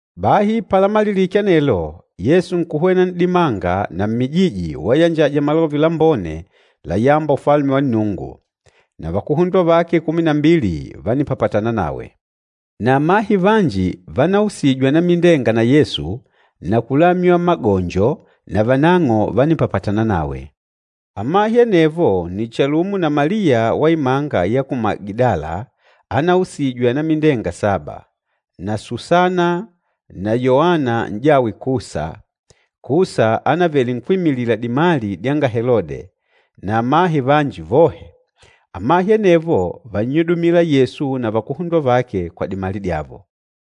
Bahi palamalilike anelo, Yesu nkuhwena n'dimanga na mmijiji wayanjaja Malove Lambone layâmba Ufalume wa Nnungu. Na vakuhundwa vake kumi na mbili vánipapatana nawe. Na amahe vanji vanausijwe anamindenga na Yesu na kulamywa magonjo navanang'o vánipapatana nawe. Amahe anevo nni chalumo na Maliya wa imanga ya ku Magidala anausijwe anamindenga saba, na Susana na Yoana n'jawe Kusa, Kusa ánavele nkwímilila dimali dyanga Helode, na amahe vanji vohe. Amahe anevo vánnyudumila Yesu na vakuhundwa vake kwa dimali dyavo.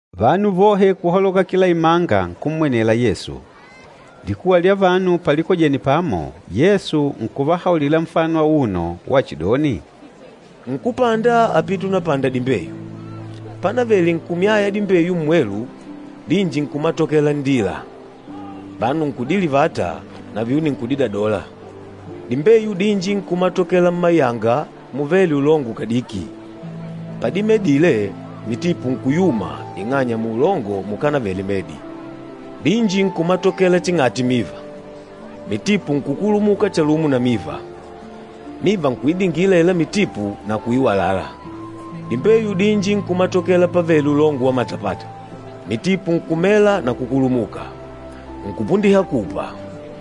Vanu vohe kuhaloka kila imanga nkummwenela Yesu. Likuwa lya vanu palikojene pamo, Yesu nkuvahaulila nfano auno wachidoni, “Nkúpanda ápite unapanda dimbeyu. Pánavèlè nkumyaya dimbeyu mmwelu, dinji nkumatokela nndila. Vanu nkudilivata, na vyuni nkudidadola. Dimbeyu dinji nkumatokela mmayanga muvêle ulongo kadiki, padimedile mitipu nkuyuma ing'anya muulongo mukanavele medi. Dinji nkumatokela ching'ati miva. Mitipu nkukulumuka chalumo na miva. Miva nkuidingila aila mitipu na kuiwalala. Dimbeyu dinji nkumatokela pavêle ulongo wa matapata, mitipu nkumela na kukulumuka, nkupundiha kupa,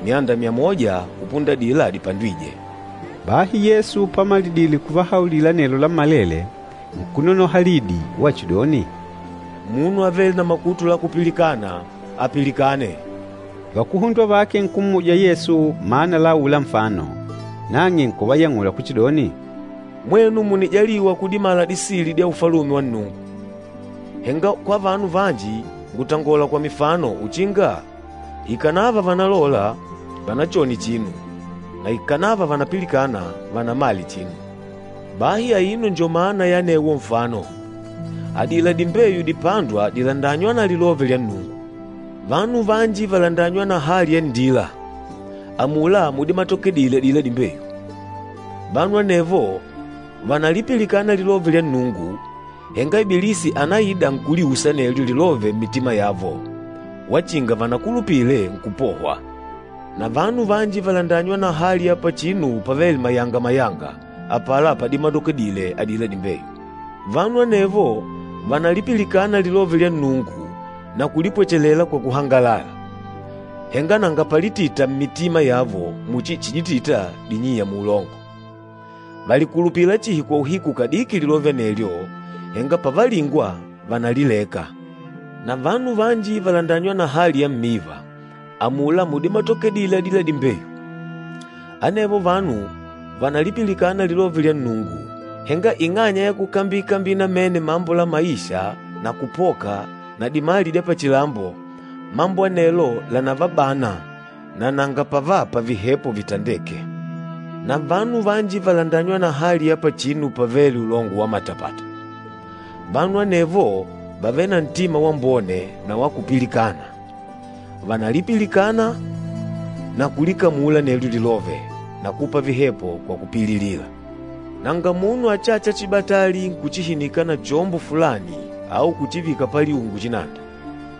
myanda myamoja kupunda adila dipandwîje.” Bahi Yesu pamalidile kuvahaulila anelo lammalele, nkunonoha lidi wachidoni, “Munu avêle na makutu la kupilikana, apilikane!” Vakuhundwa vake nkummuja Yesu mana la aula nfano. Nang'e nkuvayang'ula kuchidoni, “Mwenu mùnijaliwa kudimala disili dya Ufalume wa Nnungu. Henga kwa vanu vanji ngùtangola kwa mifano uchinga, ‘Ikànava vànalola, vanachone chinu, na ikànava vànapilikana, vanamale chinu.’ Bahi aino njo mana ya anewo nfano. Adila dimbeyu dipândwa dìlandanywa na lilove lya Nnungu. Vanu vanji vàlandanywa na hali ya nndila, amula mudimatokedile adila dimbeyu. Vanu anevo vànalipilikana lilove lya Nnungu, henga Ibilisi ànaida nkuliusa anelyo lilove mmitima yavo, wachinga vanakulupile nkupohwa. Na vanu vanji vàlandanywa na hali ya pachinu pavêle mayanga-mayanga, apala padimatokedile adila dimbeyu. Vanu anevo vànalipilikana lilove lya Nnungu na kulipwechelela kwa kuhangalala, henga nanga palitita mmitima yavo muchi chiditita dinyiya muulongo. Vàlikulupila chihi kwa uhiku kadiki lilove anelyo, henga pavalingwa, vànalileka. Na vanu vanji vàlandanywa na hali ya mmiva, amula mudimatokedile adila dimbeyu. Anevo vanu vanalipilikana lilove lya Nnungu, henga ing'anya ya kukambikambila namene mambo la maisha na kupoka na dimali dya pachilambo, mambo anelo lànavabana na nanga pavapa vihepo vitandêke. Na vanu vanji vàlandanywa na hali ya pachinu pavêle ulongo wa matapata. Vanu anevo vàvele na ntima wambone na wa kupilikana. Vànalipilikana na kulikamulila anelyo lilove na kupa vihepo kwa kupililila.” “Nanga munu achâcha chibatali nkuchihinika na chombo fulani au kuchivika paliungu chinanda.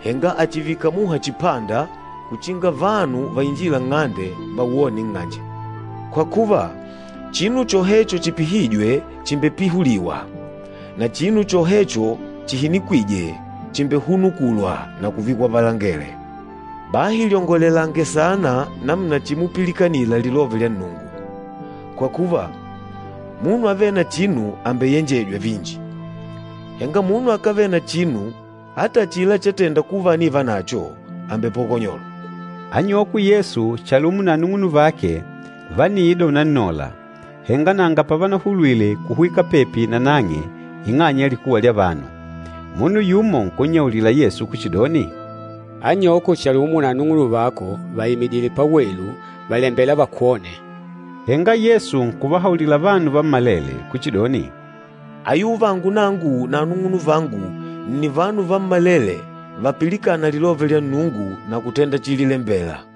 Henga àchivika muha chipanda uchinga vanu vainjîla nng'ande vawone nng'anje. Kwa kuva, chinu chohecho chipihîjwe chìmbepihuliwa, na chinu chohecho chihinikwîje chìmbehunukulwa na kuvikwa palangele. Bahi lyongolelange saana namuna chimupilikanila lilove lya Nnungu. Kwa kuva, munu avêle na chinu àmbeyenjejwa vinji, henga munu akávele na chinu ata achila chátèndà kuva ànivanacho àmbepokonyolwa.” Anyokwe Yesu chalumo na anung'unuvake vániida unannola, henga nanga pavanahulwile kuhwika pepi nanang'e ing'anya ya likuwa lya vanu. Munu yumo nkunnyaulila Yesu kuchidoni, “Anyoko chalumo na anung'unuvako vàimidile pawelu, vàlembela vakwone.” Henga Yesu nkuvahaulila vanu vammalele kuchidoni, “Ayuvangu nangu na anung'unuvangu nni vanu vammalele vapilikâna lilove lyanga Nnungu na kutenda chililembela.”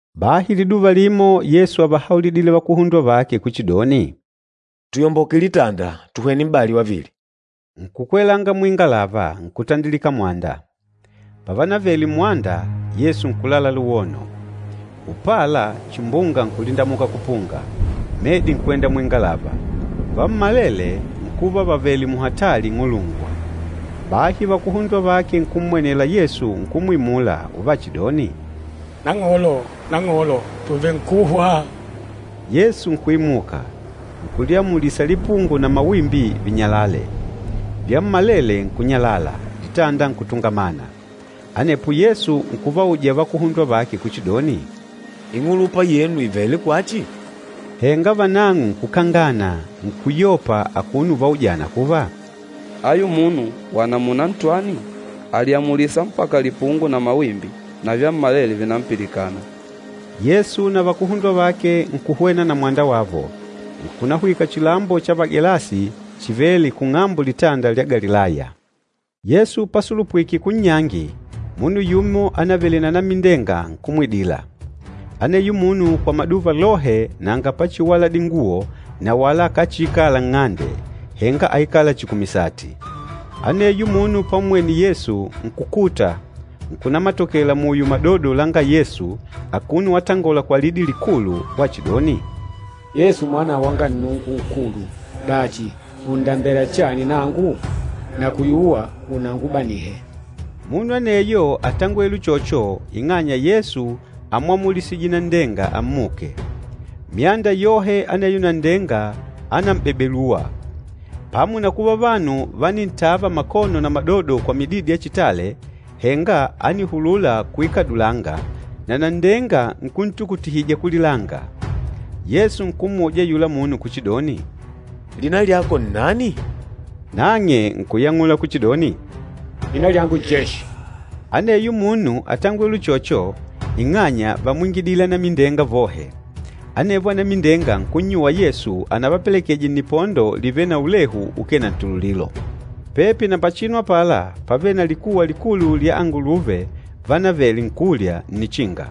Bahi liduva limo Yesu ávahaulidile vakuhundwa vake kuchidoni, “Tuyomboke litanda, tuhwene m'bali wavili.” Nkukwelanga muingalava, nkutandilika mwanda. Pavanavele mmwanda, Yesu nkulala luwono. Upala chimbunga nkulindamuka kupunga, medi nkwenda muingalava, vammalele nkuva vavèlè muhatali ing'ulungwa. Bahi vakuhundwa vake nkummwenela Yesu nkumwimula uvachidoni, “Nang'olo, Nang'olo! Tùvenkuhwa!” Yesu nkuimuka, nkuliamulisa lipungo na mawimbi vinyalale. Vyammalele nkunyalala, litanda nkutungamana. Anepo Yesu nkuvauja vakuhundwa vake kuchidoni, “Ing'ulupa yenu ìvele kwachi?” Henga vanang'o nkukangana, nkuyopa akuno uvaujana kuva, “Ayu munu wa namuna ntwani? Àliamulisa mpaka lipungo na mawimbi, na vyammalele vìnampilikana!” Yesu na vakuhundwa vake nkuhwena na mwanda wavo, nkunahwika chilambo cha Vagelasi chivêle kung'ambo Litanda lya Galilaya. Yesu pasulupwike kunnyangi, munu yumo ánavele na anamindenga nkumwidila. Aneyo munu kwa maduva lohe nanga pachiwala dinguwo na wala akáchiikala nng'ande, henga áikala chihi kumisati. Aneyo munu pammwene Yesu, nkukuta, nkunamatokela muyo madodo langa Yesu akuno watangola kwa lidi likulu wachidoni, “Yesu Mwana wanga Nnungu Nkulu! Dachi, ùndambela chani nangu? Nakuyuwa unangubanihe!” Munu aneyo átangwele uchocho ing'anya Yesu ámwamulisije nanndenga ammuke. Myanda yohe aneyo nanndenga ànambebelua. Pamo na kuva vanu vánintava makono na madodo kwa mididi ya chitale, henga ánihulula kuikadulanga, na nanndenga nkuntukutihija kulilanga. Yesu nkummuja ayula munu kuchidoni, “Lina lyako nnani?” Nang'e nkuyang'ula kuchidoni, “Lina lyangu Jeshi.” Aneyo munu átangwele uchocho ing'anya vámwingidile anamindenga vohe. Anevo anamindenga nkunnyuwa Yesu anavapelekeje nnipondo livêle na ulehu ukee na ntululilo. Pepi na pachinu apala pávele na likuwa likulu lya anguluve vanavele nkulya nnichinga.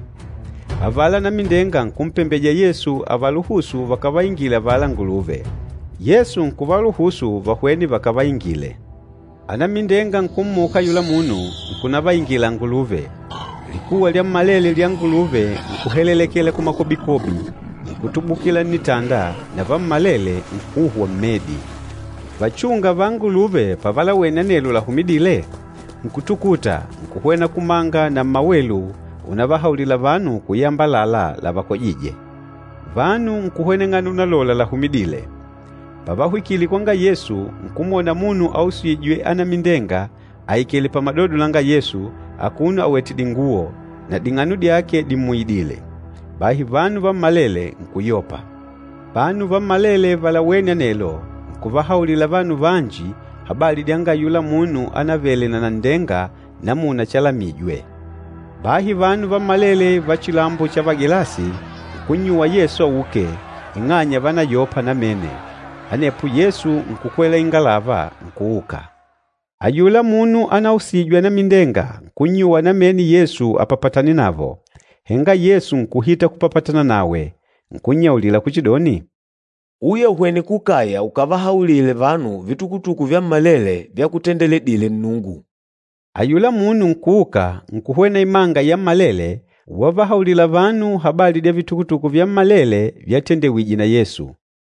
Avala anamindenga nkumpembeja Yesu avaluhusu vakavaingile avala anguluve. Yesu nkuvaluhusu vahwene vakavaingile. Anamindenga nkummuka ayula munu, nkunavaingila anguluve. Likuwa lyammalele lya anguluve nkuhelelekela kumakobikobi, nkutubukila nnitanda na vammalele nkuhwa mmedi. Vachúngà va anguluve pavalawene anelo lahumidîle, nkutukuta, nkuhwena kumanga na mmawelu unavahaulila vanu kuyamba àlalá lavakojîje. Vanu nkuhweneng'ana unalola lahumidîle. Pavahwikile kwanga Yesu, nkumwona munu ausîjwe anamindenga aikèlè pamadodo langa Yesu, akuno awètè dinguwo, na ding'ano dyake dimmuyidìlè. Bahi vanu vammalele nkuyopa. Vanu vammalele valawêne anelo, nkuvahaulila vanu vanji habali dyanga ayula munu ánavele na nanndenga namuna chalamijwe. Bahi vanu vammalele va chilambo cha Vagelasi, nkunnyuwa Yesu auke, ing'anya vánayopa namene. Anepo Yesu nkukwela ingalava nkuuka. Ayula munu anausijwe anamindenga nkunnyuwa namene Yesu apapatane navo. Henga Yesu nkuhita kupapatana nawe, nkunyaulila kuchidoni, “Uya uhwene kukaya ukavahaulile vanu vitukutuku vyammalele vyakutendeledile Nnungu.” Ayula munu nkuuka nkuhwena imanga yammalele, wavahaulila vanu habali dya vitukutuku vyammalele vyatendewije na Yesu.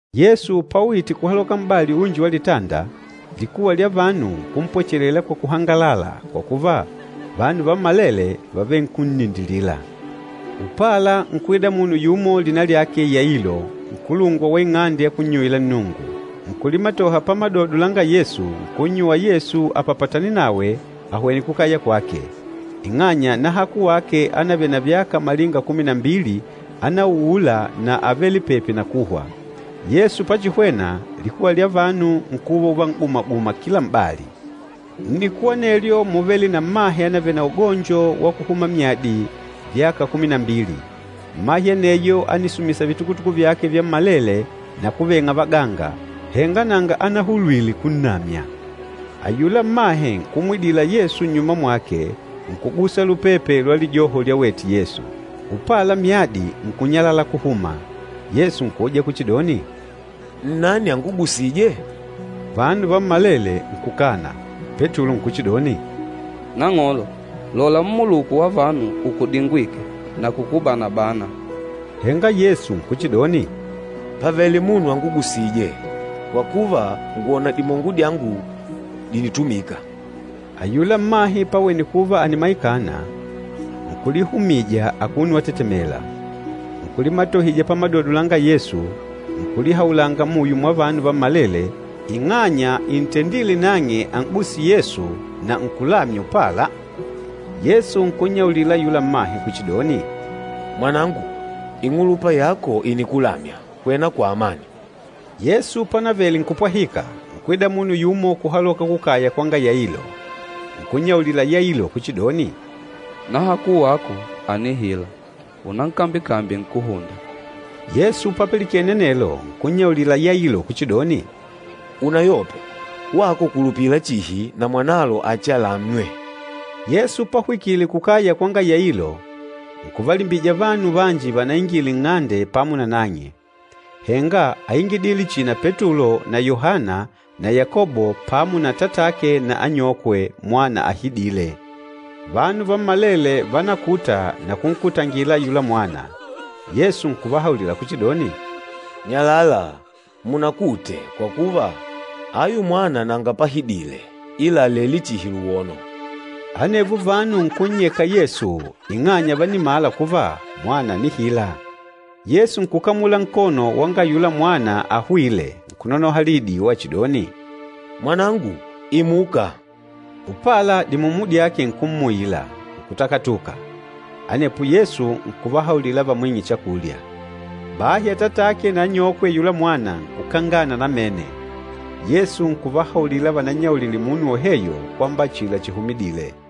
Yesu pauyite kuhaloka m'bali unji wa litanda, likuwa lya vanu nkumpwechelela kwa kuhangalala, kwa kuva, vanu vammalele vávele nkunnindilila. Upala nkuida munu yumo lina lyake Yailo, nkulungwa wa ing'ande ya kunnyuwila Nnungu. Nkulimatoha pamadodo langa Yesu, nkunnyuwa Yesu apapatane nawe ahwene kukaya kwake, ing'anya nahaku wake ánavele na vyaka malinga kumi na mbili ánauula na ávele pepi na kuhwa. Yesu pachihwena, likuwa lya vanu nkuva uvan'gumaguma kila m'bali. Nnikuwa anelyo múvele na mmahe ánavele na ugonjo wa kuhuma myadi vyaka kumi na mbili. Mmahe aneyo ánisumisa vitukutuku vyake vyammalele na kuveng'a vaganga, henga nanga anahulwile kunnamya. Ayula mmahe nkumwidila Yesu nnyuma mwake nkugusa lupepe lwa lijoho lyawete Yesu. Upala myadi nkunyalala kuhuma. Yesu nkuuja kuchidoni, “Nnani angugusîje?” Vanu vammalele nkukana. Petulo nkuchidoni, “Nang'olo, lola mmuluku wa vanu ukudingwîke na kukubana-bana.” Henga Yesu nkuchidoni, “Pàvele munu angugusîje, kwa kuva, ngwòna dimongo dyangu dìnitumika.” Ayula mmahe pawene kuva ànimaikana, nkulihumija akuno watetemela, nkulimatohija pamadodo langa Yesu, nkulihaulanga muyo mwa vanu vammalele ing'anya intendîle nang'e an'guse Yesu na kuva, nkulamywa upala. Yesu nkunnyaulila ayula mmahe kuchidoni, “Mwanangu, ing'ulupa yako ìnikulamya, hwena kwa amani.” Yesu pánavele nkupwahika, nkwida munu yumo kuhaloka kukaya kwanga Yailo. Nkunnyaulila Yailo kuchidoni, “Nahaku wako ànihila, unamkambye-kambye nkúhunda.” Yesu papilikene anelo nkunyaulila Yailo kuchidoni, “Unayope, wako kulupila chihi na mwanalo achialamywe.” Yesu pahwikile kukaya kwanga Yailo, nkuvalimbija vanu vanji vanaingile nng'ande pamo na nang'e, henga áingidile chihi na Petulo na Yohana na Yakobo pamo na atatake na anyokwe mwana ahidîle. Vanu vammalele vánakuta na kunkutangila ayula mwana. Yesu nkuvahaulila kuchidoni, “Nyalala, munakute, kwa kuva, ayu mwana nanga pahidile ila àlele chihi luwono!” Anevo vanu nkunnyeka Yesu ing'anya vánimala kuva mwana ànihila. Yesu nkukamula nkono wanga ayula mwana ahwîle nkunonoha lidi wachidoni, “Mwanangu, imuka!” Upala dimumu dyake nkummuila, nkutakatuka. Anepo Yesu nkuvahaulila vamwing'e chakulya. Bahi atatake na anyokwe ayula mwana nkukangana namene, Yesu nkuvahaulila vanannyaulile munu woheyo kwamba achila chihumidîle.